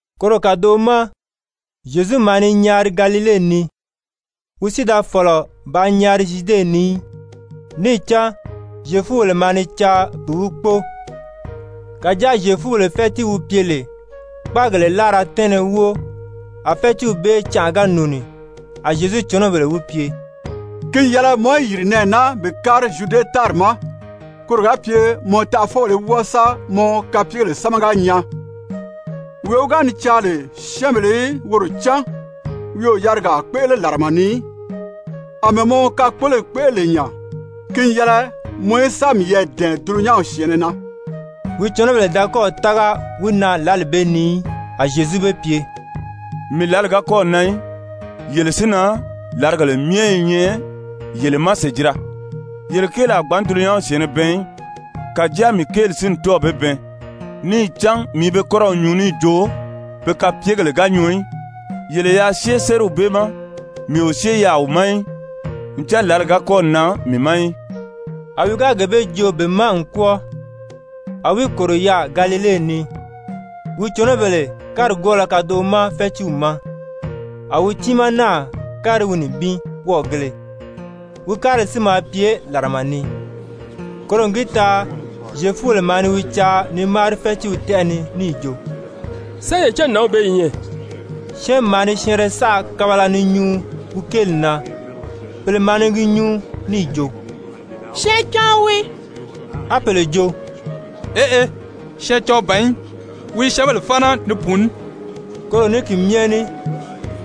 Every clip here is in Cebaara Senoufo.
Koro kàdoʔo ma Zyezu maa ni nyaari Galile ni, wi si da fɔ̀lɔ bàā nyaari Zyude ni í, níì cán Zyefubèle maa ni caa bi wi kpóo. Kàjáa Zyefubèle fɛ́tii wi pye lè Kpáagèle Láara Tɛ́ɛnnɛ wóo a fɛ́tiiw bee canʔa ga nùuni, a Zyezu cɔnɔbèle wi pye: «Ki n yɛlɛ mɔ í yìri nɛɛ naa bi kári Zyude tári ma, koro ga pye mɔ taʔafɔbèle í wɔ́ɔ sa mɔ kapyegèle sámaga nyaa. Wee wi ga ni caa lè syɛ́ɛnbèle í woro cán, wi o yarigaa kpéʔele làrama ni í. Amɛɛ mɔ kakpoloyi kpéʔele lè nya, ki n yɛlɛ mɔ í sa miyɛɛ dɛ̀ɛn dulunyanw syɛ̀ɛnnɛ na.» (Wi cɔnɔbèle da kɔ́ɔ̀ tága wi na lǎli bee ni í.) A Zyezu be pye: «Mii lǎli ga kɔ́ɔ̀ nan í. Yele si na, làrigèle myɛ i nyɛ yele ma sèjira. Yele kéeli a gbǎn dulunyanw syɛ̀ɛnnɛ bɛɛn í. Kàjáa mii kéeli si n tɔ́ɔ̀ be bɛɛn níì cán mii i be kɔ́rɔw nyuu níì jo be kapyegèle ga nyɔɔ í. Yele yaa syée sériw bee ma. Mii o syée yaà wi ma í, ncan lǎli ga kɔ́ɔ̀ nan mii ma í.» A wi ga gee bee joo be ma n kwɔ́ɔ, a wi kòro yaà Galile ni. Wi cɔnɔbèle kárigwɔɔlɔ kadoʔo ma fɛ́tiiw ma, a wi tiimaa náà kári wi nibin wɔ́ɔgēle, wi kárili si maa pye làrama ni. Koro n gi taa Zyefubèle maa ni wi caa ni máari fɛ́tiiw tɛ́ʔɛ ni níì jo: «Sán ye cán nǎnw bee i nyɛ?» Syɛ́ɛnmi maa ni syɛɛnrɛ saʔa kabala ni nyuu wi kéeli na. Pèle maa ni gi nyuu níì jo: «Syɛɛncaɔn wii.» A pèle jo: «Eʔe, syɛɛncaɔn ban í, wi i syɛ́ɛnbèle fáana ni pùuní.» Koro ní ki myɛ ní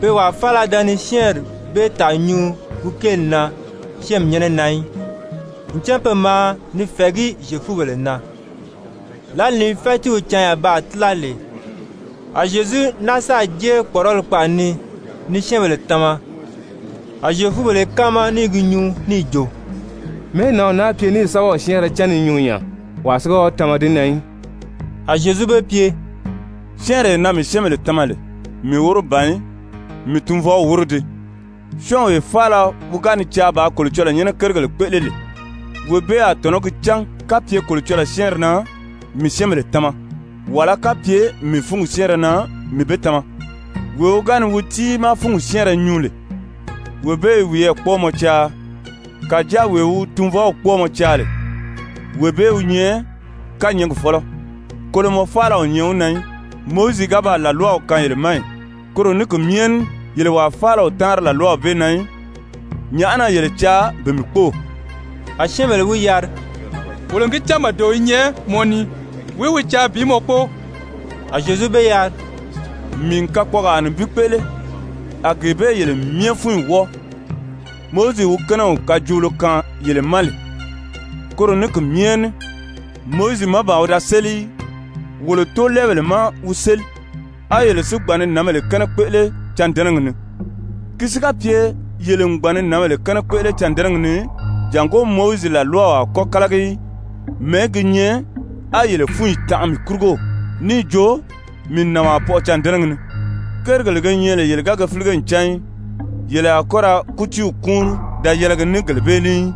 pe wàa faala da ni syɛ́ɛnri bee tàa nyuu wi kéeli na syɛ́ɛnmi nyɛ́nɛ na í, ncan pe maa ni fɛ̀ɛgí Zyefubèle na. Lǎli ni fɛ́tiiw canya baa tíla lè, a Zyezu náa sáà jée kpɔ̀ʔɔrɔli kpaʔa ni ni syɛ́ɛnbèle tama. A Zyefubèle i káama ní i gi nyuu níì jo: «Mɛ̀ɛ́ nǎnw naa pye níì sɛ́bɛw syɛ́ɛnrɛ cán ni nyuu nya, wàa si ga wi tama di na í?» A Zyezu be pye: «Syɛ́ɛnree na mii syɛ́ɛnbèle tama lè, mii wóro ban í, mii Tunvɔw wóro dii. Syɔ́ɔnwee faala wi ga ni caa bàā Kolocɔlɔɔ nyɛ́nɛ kérigèle kpéʔele lè, wee bee a tɔ̀nɔ́ gi cán kapye Kolocɔlɔɔ syɛ́ɛnri na mii syɛ́ɛnbèle tama, wàlá kapye mii fúngi syɛ́ɛnrɛ na mii be tama. Wee wi ga ni wi tiimaa fúngi syɛ́ɛnrɛ nyuu lè, wee bee i wiyɛɛ kpɔ́ɔmɔ caa. Kàjáa wee wi wi tunvɔw kpɔ́ɔmɔ caa lè, wee bee wi nyɛ kányɛɛgi fɔ́lɔ, kolomɔ faala o nyɛ wi na í. Mowizi ga baa làlwaw kaan yele ma ì? Koro ní ki myɛ ní yele wàa faala o táanri làlwaw bee na í. Nyàʔá na yele caa bi mii kpóo?» A syɛ́ɛnbèle wi yari: «Wolo n gi cán màdeo i nyɛ mɔ ni. Wìí wi caa bi mɔ kpóo?» A Zyezu be yari: «Mii n kakpɔɔgaa nibin kpéʔele, a gee bee yele myɛ fúnyi wɔ́ɔ. Mowizi wi kɛ́nɛw kajoolo kaan yele ma, koro ní ki myɛ ní Mowizi má ban wi da séli í, wolo tóolɛɛbèle má wi séli, á yele si gbàn ni nǎnbèle kɛ́nɛ kpéʔele cândɛnɛgi ni. Ki si ga pye yele n gbàn ni nǎnbèle kɛ́nɛ kpéʔele cândɛnɛgi ni jàngó Mowizi làlwaw a kɔ́ kálagi í, mɛ̀ɛ́ gi nyɛ á yele fúnyi tanʔa mii kurugo níì jo mii n nànwaa pɔʔɔ cândɛnɛgi ni? Kérigèle ge nyɛ lè yele ga ge fílige n cán í, yele a kɔ́ ra kútiiw kúunri da yɛlɛgi ní gele bee ní í,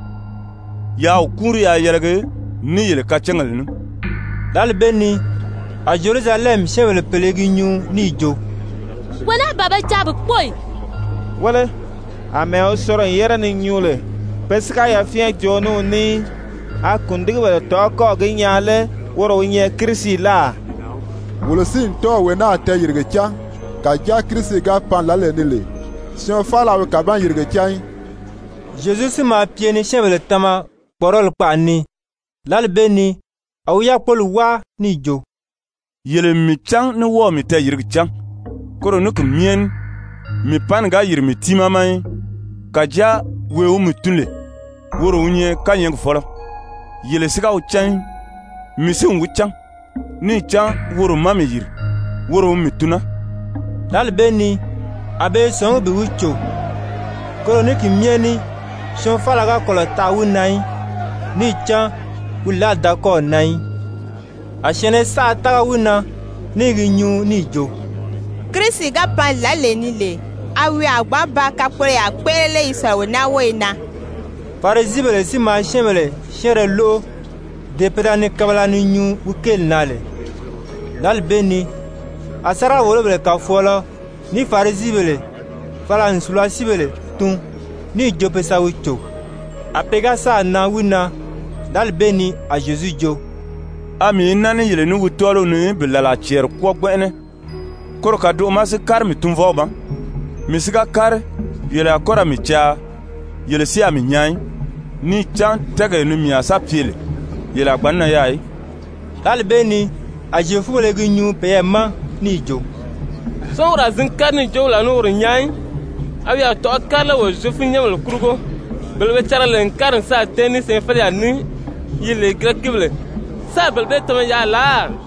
yaa wi kúunri yaa yɛlɛgi ní yele kacángèle ní.» Lǎli bee ni a Zyerusalɛmi syɛ́ɛnbèle pèle i gi nyuu níì jo: «Wee naa ban be caa bi kpóo ì? Wéle, àmɛɛ wi soro n yére ni nyuu lè pe si ga yafyɛn joo ní wi ní í, a kùndigibèle tɔ̀ʔɔ́ kɔ́ɔ̀ gi nyaa lé woro wi nyɛ Kirisi láà? Wolo si n tɔ́ɔ̀ wee naa tɛɛyìrige cán, kàjáa Kirisi ga pan lǎlee ni lè, syɔɔn faala a wi kàban-yìrige cán í.» Zyezu si maa pye ni syɛ́ɛnbèle tama kpɔ̀ʔɔrɔli kpaʔa ni, lǎli bee ni a wi yákpoli wáa níì jo: «Yele n mii cán ní wɔ́ɔ̀ mii tɛɛyìrigi cán! Koro ní ki myɛ ní mii panni ga yìri mii tiimaa ma í, kàjáa wee wi mii tun lè, woro wi nyɛ kányɛɛgi fɔ́lɔ, yele si ga wi cán í. Mii si n wi cán. Níì cán woro má mii yìri, woro wi mii tun naa.» Lǎli bee ni a be i sɔ̀ngí bi wi cò, koro ní ki myɛ ní syɔɔn faala ga kɔlɔ̀ taʔa wi na í, níì cán wi lǎli da kɔ́ɔ̀ nan í. A syɛ̀ɛnnɛ saʔa tága wi na, ní i gi nyuu níì jo: «Kirisi ga pan lǎlee ni lè, a wi a gbǎn ba kakpoloyaa kpéʔele lé yi sɔ̀lɔ wee naa wóyo na?» Farisibèle si maa syɛ́ɛnbèle syɛ́ɛnrɛ lóʔo, dee pe da ni kabala ni nyuu wi kéeli na lè. Lǎli bee ni a sáriga-wòlobèle kàfɔɔlɔ ní Farisibèle fala n sùlasiibéle tun níì jo pe sa wi cò. A pe ga sáà nan wi na, lǎli bee ni a Zyezu jo: «A mii i naa ní yele ní wii tɔ́ɔliw ni bi làlaa cɛɛri kwɔ́ɔ gbɛnʔɛnɛ, koro kàdoʔo ma si kári mii Tunvɔw ma. Mii si ga kári, yele a kɔ́ ra mii caa, yele si a ní mii nyaa í. Níì cán tɛ́ɛgee ni mii a sa pye lè, yele a gbǎn nan yaà í.» Lǎli bee ni a Zyefubèle i gi nyuu peyɛɛ ma níì jo: «Sán woro a zǐn kári níì jo wolo a ní woro nyaa í? A wi a tɔ̀ʔɔ́ kári lé wolo Zyefunyɛnbèle kurugo, bele be cariga lè n kári n sáà tɛ́ɛn ní syɛɛnfeleyaa ní yi lè Girɛkibèle, sáā bele bee tama yaà láà?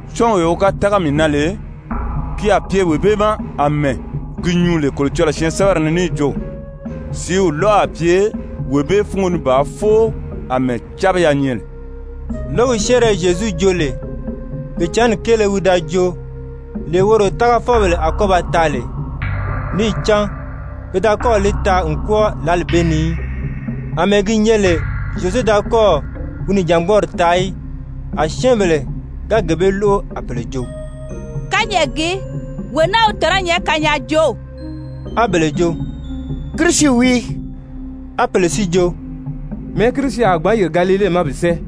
Syɔ́ɔnwee wi ga tága mii na lè, ki a pye wee bee ma àmɛɛ gi nyuu lè Kolocɔlɔɔ syɛɛnsɛbɛri ni níì jo: Sìíw lɔ̀ʔɔ a pye wee bee fúngo ni bàā fóo àmɛɛ cábiya nyɛ lè.» Lǒgi syɛ́ɛnrɛ Zyezu joo lè, Pìicǎnni kéele wi da joo, lee woro tágafɔbèle a kɔ́ ba taa lè. Níì cán pe da kɔ́ɔ̀ li taa n kwɔ́ɔ lǎli bee ni í, àmɛɛ gi nyɛ lè Zyezu da kɔ́ɔ̀ wi nìjangbɔɔri taa í. A syɛ́ɛnbèle ga gee bee lóʔo, a pèle jo: «Kányɛʔɛ gii, wee naa wi tɔ̀nɔ́ nyɛ kanyaajoow.» A bele jo: «Kirisi wii.» A pèle si jo: «Mɛ̀ɛ́ Kirisi a gbǎn yìri Galile ma bi sɛ́ɛ?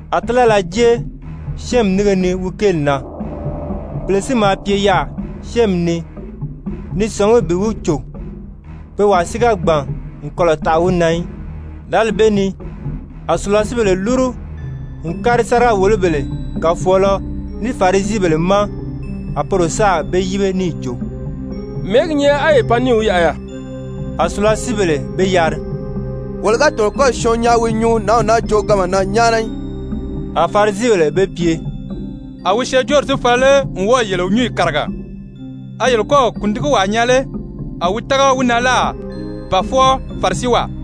A tílala jée syɛ́ɛnmi nínge ni wi kéeli na. Pèle si maa pye yaà syɛ́ɛnmi ni ni sɔ̀ngí bi wi cò, pe wàa si ga gbàn n kɔlɔ̀ taʔa wi na í. Lǎli bee ni a sùlasiibèle lúru n kári sáriga-wòlobèle kàfɔɔlɔ ní Farisibèle ma. A poro sáà be yíbe níì jo: «Mɛ̀ɛ́ gi nyɛ á ye pan níì wi yaʔa yaà?» A sùlasiibèle be yari: «Wolo ga tɔ̀nɔ n kɔ́ɔ̀ syɔɔn nyaa wi i nyuu nǎnw naa jooganma na nyáana í.» A Farisibèle be pye: «A wi syɛɛnjóori si fala lé n wɔ́ɔ̀ yele nyǔnyi kàriga? A yele kɔ́ɔ̀ kùndigiwaa nyaa lé a wi tága wi na láà ba fwɔɔ Farisiwaa?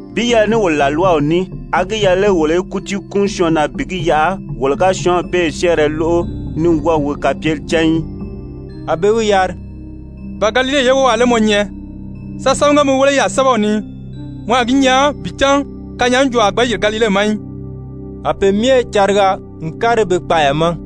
«Bi yɛlɛ ní wolo làlwaw ní, a gi yɛlɛ lé wolo í kútii kúun syɔɔn na bi gi yaʔa wolo ga syɔ́ɔnw bee syɛ́ɛnrɛ lóʔo ní wɔ́ɔ̀ wi kapyeli cán í?» A be wi yari: «Ba Galile ye wówaa lé mɔ nyɛ? Sa sámaga mi wéle yaà sɛ́bɛw ni. Mɔ a gi nyaa bi cán kanyaajooo a gbǎn yìri Galile ma í.» [A pe myɛ cariga n kári be kpaaya ma.